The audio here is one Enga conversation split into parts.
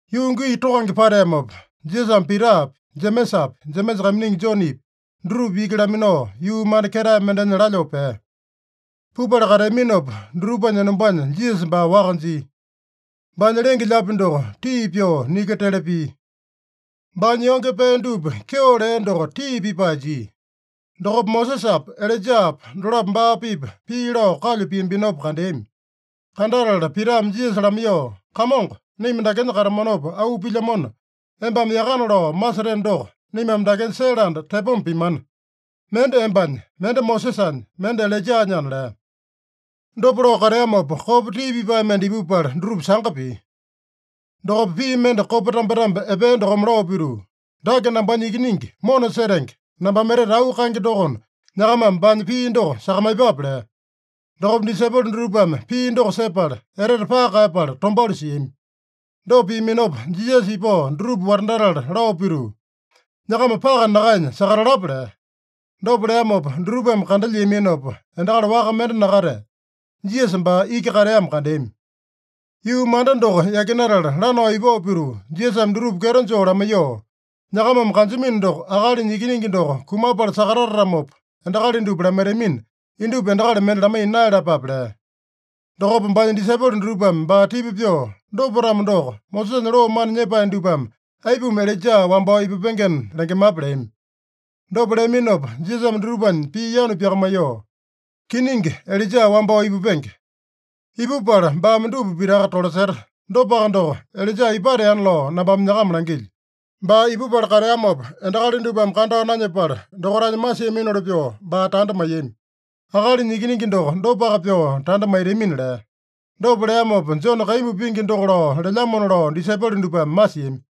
Yuu gii tokange pateamopa, Jisasame Pitapi, Jemesapi, Jemesa kaiminingi Jonepi, dutupa iki laminao, yuu manda ketae mendenya lalyoo pea. Pupala kateaminopa, dutupanya enombanya Jisasa baa waka jia. Baanya lenge-lyaapi doko tii pyoo niki tele pia. Baanya yonge pee dupa kyeo lea doko tii pipae jia. Dokopa Mosesapa, Ilaijapa dolapo baa-pipa pii lao kalyu piambinopa kandeami. Kandatala Pitame Jisasa lamaiyoo, “Kamongo, naima dakenya katamanopa auu pilyamona, embame yakana lao maseteno doko, naimame dakenya sele anda tepoma pimana. Mende embanya, mende Mosesanya, mende Ilaijanyana” lea. Dopa lao kateamopa, kopa tii pipae mende ipupala dutupa sanga pia. Dokopa pii mende kopa tambetambe epea dokome lao pituu, “Dake nambanya Ikiningi mona setenge, nambame etete auu kaenge dokona, nyakamame baanya pii doko sakamaiyepape” lea. Dokopa disaipolo dutupame pii doko sepala, etete paka kaeyapala tombauli siami. Dopa piaminopa, Jisasa ipao dutupa watandatala lao pituu, “Nyakama paka nakaenya sakatalapa” lea. Dopa leamopa dutupame kandalyiaminopa, endakali waka mende nakatea. Jisasa baa iki kateamo kandeami. Yuu manda doko yakinatala lanao ipao pituu, Jisasame dutupa kyeto joo lamaiyoo, “Nyakamame kanjamino doko, Akalinya Ikiningi doko kumapala sakatatatamopa, endakali dupa lamaitamina, indupa endakali mende lamaiya naeyalapape” lea. Dokopa baanya disaipolo dutupame baa tipa pyoo, “Dopa-tamo doko, Mosesanya loo mana nyepae dupame aipuma Ilaija wambao ipupengena lengemape?” leami. Dopa leaminopa Jisasame dutupanya pii yanu pyakamaiyoo, “Kiningi, Ilaija wambao ipupenge. Ipupala baame dupa pitaka tolaseta. Dopaka doko, Ilaija ipateana lao nambame nyakama langilyo. Baa ipupala kateamopa endakali dupame kandao nanyepala, dokaitanya masiaminoli pyoo baa tanda maiyami. Akalinya Ikiningi doko dopaka pyoo tanda maitamina” lea. Dopa leamopa, Jone kaimbu pingi doko lao lelyamona lao disaipolo dupame masiami.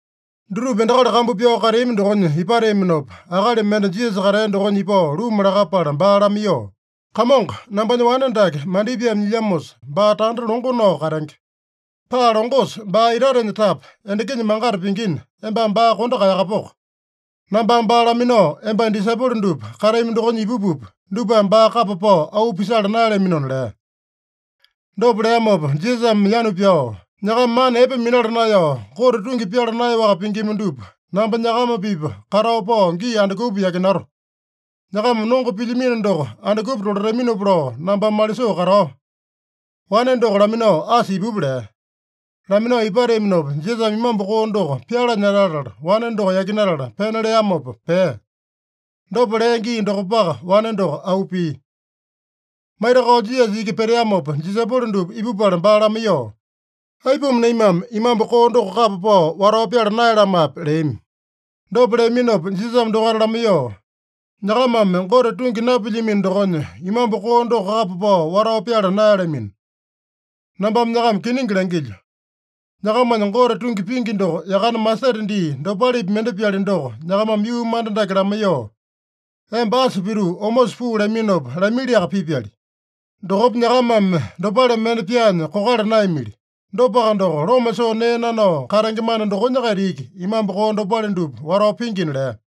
Dutupa endakali kambu pyao kateami dokonya ipateaminopa, akali mende Jisasa katea dokonya ipao luma lakapala baa lamaiyoo, “Kamongo, nambanya wane dake mandipaeme nyilyamosa, baa tanda longo nao katenge. Paa longosa baa itatenya tapa, endakinya mangata pingina, embame baa kondo kaeyakapoko. Nambame baa laminao embanya disaipolo dupa katami dokonya ipupupa, dupame baa kapa pao auu pisala naeyalaminona” lea. Dopa leamopa Jisasame yanu pyao, “Nyakama mana epe minala naeyao, Gote tungi pyala naeyaowaka pingima dupa, namba nyakama-pipa katao pao gii andukupa yakinato? Nyakama nongo pilyamino doko andukupa tolataminopa lao nambame malisoo katao? Wane doko laminao asa ipupa” lea. Laminao ipateaminopa, Jisasame imambu koo doko pyalanya latala, wane doko yakinatala pena leamopa pea. Dopa lea gii dokopaka, wane doko auu pia. Maitakao Jisasa iki peteamopa, disaipolo dupa ipupala baa lamaiyoo, “Aipuma naimame imambu koo doko kapa pao watao pyala naeyalamape?” leami. Dopa leaminopa Jisasame dokaita lamaiyoo, “Nyakamame Gote tungi napilyamino dokonya, imambu koo doko kapa pao watao pyala naeyalamino. Nambame nyakama kiningi langilyo: Nyakamanya Gote tungi pingi doko yakane masete dii dopalepi mende-pyali doko, nyakamame yuu manda dake lamaiyoo, ‘Emba asa pituu omosa puu’ laminopa, lamiliaka pipyali. Dokopa nyakamame dopale mende pyaanya kokala naeyamili. Dopaka doko, loma soo nee nanao katenge mana dokonya-kaita iki imambu koo dopale dupa watao pingina” lea.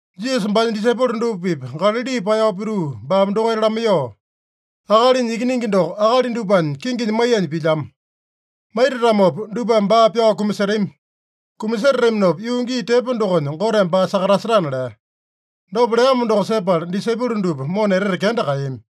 Jisasa baanya disaipolo dupa-pipa Galali paeyao pituu baame dokaita lamaiyoo, “Akalinya Ikiningi doko akali dupanya kinginya maiyanya pilyamo. Maitatamopa dupame baa pyao kumasetami. Kumasetataminopa yuu gii tepo dokonya, Goteme baa sakatasetana” lea. Dopa leamo doko sepala, disaipolo dupa mona etete kenda kaeyami.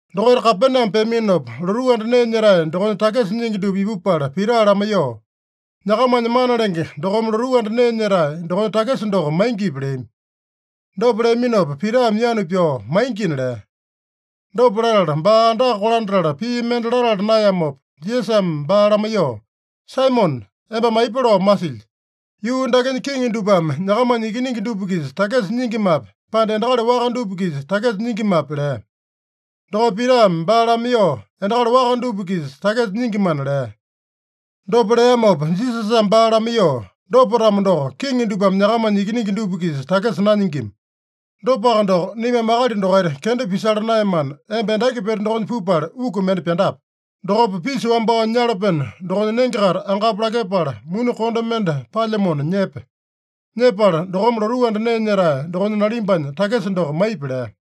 Dokaita Kapename peaminopa, lotuu anda nee nyetae dokonya takisa nyingi dupa ipupala Pita lamaiyoo, “Nyakamanya mana lenge dokome lotuu anda nee nyetae dokonya takisa doko maingipi?” leami. Dopa leaminopa Pitame yanu pyao, “Maingina” lea. Dopa latala, baa andaka kolandatala pii mende latala naeyamopa, Jisasame baa lamaiyoo, “Saimone, embame aipa lao masilyi? Yuu dakenya kiŋi dupame nyakamanya ikiningi dupa-kisa takisa nyingimape, pande endakali waka dupa-kisa takisa nyingimape?” lea. Dokopa Pitame baa lamaiyoo, “Endakali waka dupa-kisa takisa nyingimana” lea. Dopa leamopa Jisasame baa lamaiyoo, “Dopa-tamo doko, kiŋi dupame nyakamanya ikiningi dupa-kisa takisa nanyingima. Dopaka doko, naimame akali dokaita kenda pisala naeyamana, emba endaki pete dokonya pupala, uku mende pyandape. Dokopa pisa wambao nyalapeno dokonya nenge-kaita angapu lakepala, muni konde mende palyamona nyepe. Nyepala, dokome lotuu anda nee nyetae dokonya nalimbanya takisa doko maipi” lea.